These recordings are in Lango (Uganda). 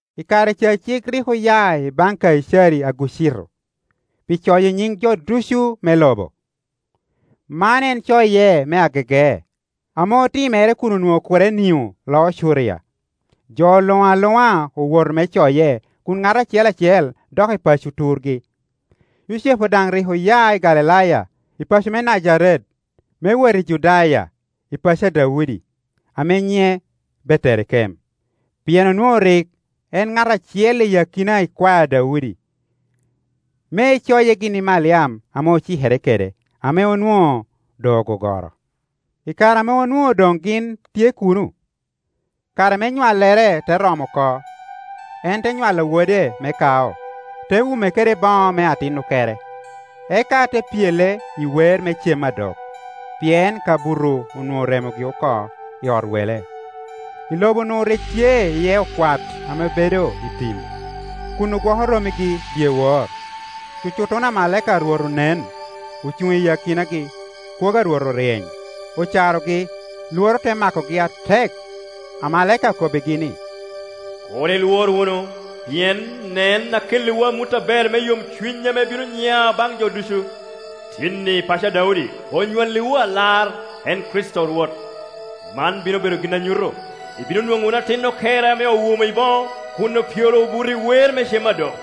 I kare ca cik rik oya i baŋ Kaicari Augucito pi coyo nyiŋ jo ducu me lobo. Man en coye me agege, ame otimere kun onwoŋo Kurenio loo Curia. Jo luŋ aluŋa owoto me coye kun ŋat acel acel dok i paco turgi. Yucepu daŋ rik oya i Galilaya, i paco me Najaret, me wot i Judaya, i paco a Daudi ame nyiŋe Beterekem, pien onwoŋo rik en ŋat acel i akina ikwae a Daudi, me eeoye gin i Maliam ame ocikere kede, ame onwoŋo doŋ ogogoro. I kare ame onwoŋo doŋ gin tye kuno, kare me nywallere te romo oko. En te nywalo wode me kao, te wume kede boŋo me atin okere, eka te pyele i weer me cem a dok, pien kabuto onwoŋo oremogi oko i ot wele. I lobo-nu rik tye iye okwat ame bedo i tim, kun ogwoko rommigi dyewor. Cutocuto amalaika a Rwot onen, ocuŋ i akinagi, kwogo a Rwot oryeny, ocarogi, lworo te makogi atek. Amalaika okobbigi ni, “Kur ilwor wunu pien nen, akelliwu amut aber me yomcuny ame bino nya baŋ jo ducu. Tin-ni, i paco a Daudi, onywalliwu Alar, en Kricito Rwot. Man bino bedo gin a nyuto: ibino nwoŋo wunu atin okere ame owumo i boŋo, kun opyelo obuto i weer me cem a dok.”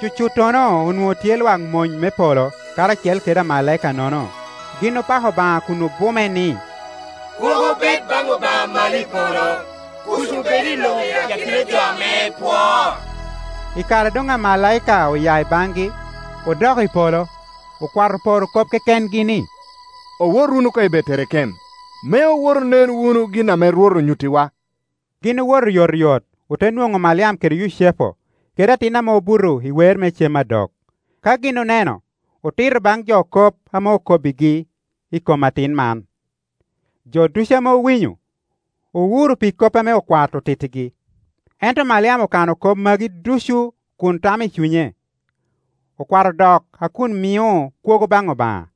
Cucuttono onwoŋo tye lwak mony me polo karacel kede amalaika-nono: gin opako Obaŋa kun obume ni, “Kwogo bed baŋ Obaŋa malo i polo, kuc obed i lobo i akina jo ame epwoo.” I kare a doŋ omalaika oya i baŋi, odok i polo, okwat oporo kop kekengi ni, “Owot wunu koŋ i Beterekem, me owot onen wunu gin ame Rwot onyuttiwa.” Gin owoto oyotoyot, ote nwoŋo Maliam kede Yucepu, kede atin ame obuto i weer me cem a dok. Ka gin oneno, otito baŋ jo kop ame okobbigi i kom atin man; jo ducu ame owinyo, owuro pi kop ame okwat otittigi. Ento Maliam okano kop magi ducu kun tamo i cunye. Okwat odok a kun mio kwogo baŋ Obaŋa,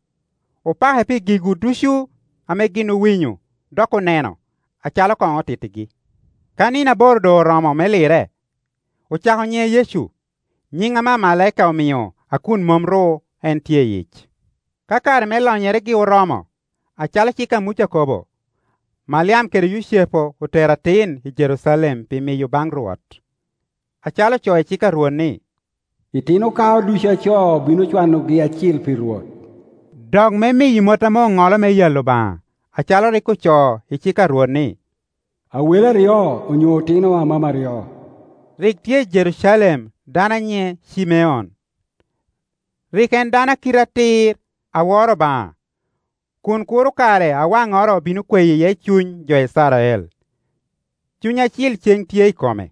opake pi gigu ducu ame gin owinyo, dok oneno, acalo koŋ otittigi. Ka nino aboro doŋ oromo me lire, ocako nyiŋe Yecu, nyiŋ ame amalaika omio a kun mom ru en tye i yic. Ka kare me lonyeregi oromo, acalo cik a Muca okobo, Maliam kede Yucepu otero atin i Jerucalem pi miyo baŋ Rwot, (acalo ocoo i cik a Rwot ni, “Itino kao ducu a co obino cwanogi acil pi Rwot”) dok me miyo mot ame oŋolo me yalo Obaŋa, acalo rik ocoo i cik a Rwot ni, “awele aryo onyo otino amam aryo.” Rik tye i Jerucalem dano a nyiŋe Cimeon. Rik en dano a kite atir, a woro Obaŋa, kun kuro kare a waŋoro obino kweyo iye cuny jo Icrael; Cuny Acil ceŋ tye i kome.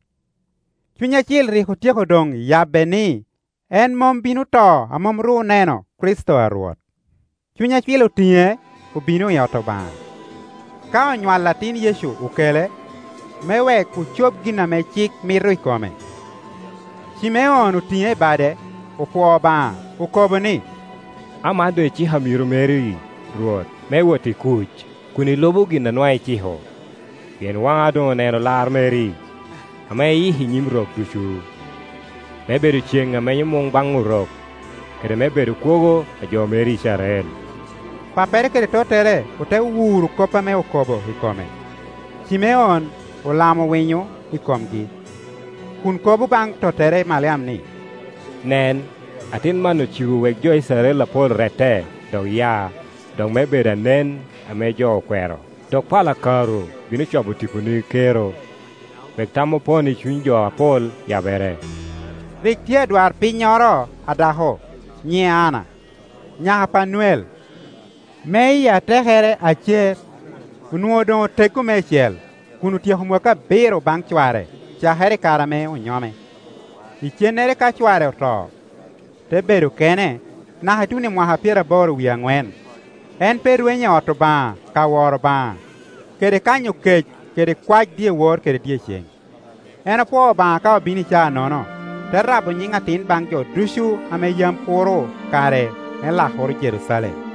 Cuny Acil rik otyeko doŋ yabbe ni en mom bino to a mom ru oneno Kricito a Rwot. Cuny Acil otiŋe obino i ot Obaŋa. Ka onywal atin Yecu okele, me wek ocob gin ame cik mito i kome. Cimeon otiŋe i bade, opwoo Obaŋa, okobo ni, “Aman doŋ iciko amiro meri, Rwot, me wot i kuc, kun ilubo gin a nwaŋ iciko; pien waŋa doŋ oneno lar meri ame iyiko i nyim rok ducu, me bedo ceŋ a menyo muŋ baŋ Orok, kede me bedo kwogo a jo meri Icrael.” Pappere kede tottere ote wuro kop ame okobo i kome. Cimeon olamo winyo i komgi, kun kobo baŋ tottere Maliam ni, “Nen, atin man ocibo wek jo Icrael apol rette, dok ya, dok me bedo anen ame jo okwero, (dok pala karu bino cobo tiponi kero), wek tam opono i cuny jo apol yabere.” Rik tye adwarpinnyoro a dako, nyiŋe Anna, nyaka a Panuel, me i atekere Acer; onwoŋo doŋ oteggo meicel, kun otyeko mwakki abiro baŋ cware cakere i kare ame onyome, icennere ka cware oto, te bedo kene, naka ituno i mwaka pyeraboro wie aŋwen. En pe rwenyo i ot Obaŋa ka woro Obaŋa kede kanyo kec kede kwae dyewor kede dyeceŋ. En opwoo Obaŋa ka obino i caa-nono, te rabo nyiŋ atin baŋ jo ducu ame yam kuro kare me lakoro Jerucalem.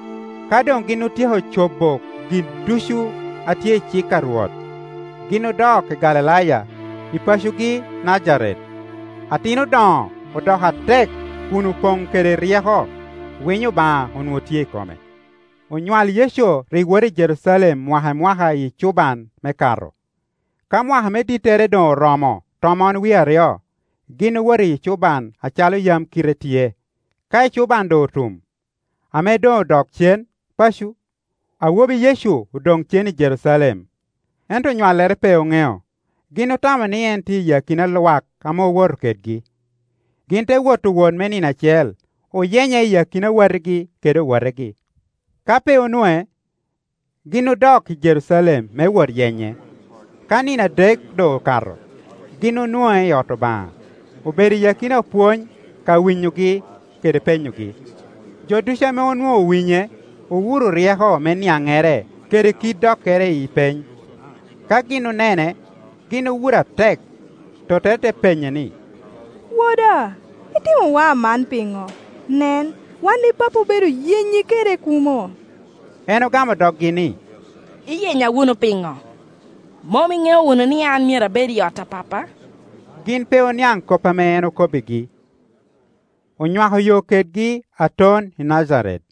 Ka doŋ gin otyeko cobo gin ducu a tye i cik a Rwot, gin odok i Galilaya, i pacogi Najaret. Atin odoŋo, odoko atek, kun opoŋ kede ryeko. Winyo Obaŋa onwoŋo tye i kome. Onywal Yecu rik woto i Jerucalem mwaka i mwaka i ecuban me Kato. Ka mwaka me dittere doŋ oromo tomon wie aryo, gin owoto i ecuban acalo yam kite tye. Ka ecuban doŋ otum, ame doŋ odok cen paco, awobi Yecu odoŋ cen i Jerucalem, ento onywalle pe oŋeo; gin otamo ni en tye i akina lwak ame owoto kedgi. Gin te woto wot me nino acel, oyenye i akina watigi kede owotegi; ka pe onwoŋe, gin odok i Jerucalem me wot yenye. Ka nino adek doŋ okato, gin onwoŋe i ot Obaŋa, obedo i akina opwony ka winyogi kede penyogi. Jo ducu ame onwoŋo owinye, owuro ryeko me niaŋŋere kede kit dokkere i peny. Ka gin onene, gin owuro atek, tottere te penye ni, “Woda, itimowa aman piŋo? Nen, wan i pappi obedo yenyi kede kumo.” En ogamo doggi ni, “Iyenya wunu piŋo? Mom iŋeo wunu ni an myero abed i ot a Pappa?” Gin pe oniaŋ kop ame en okobbigi. Onywako yo kedgi aton i Najaret,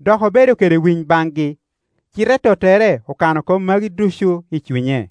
dok obedo kede winy baŋgi: cite tottere okano kop magi ducu i cunye.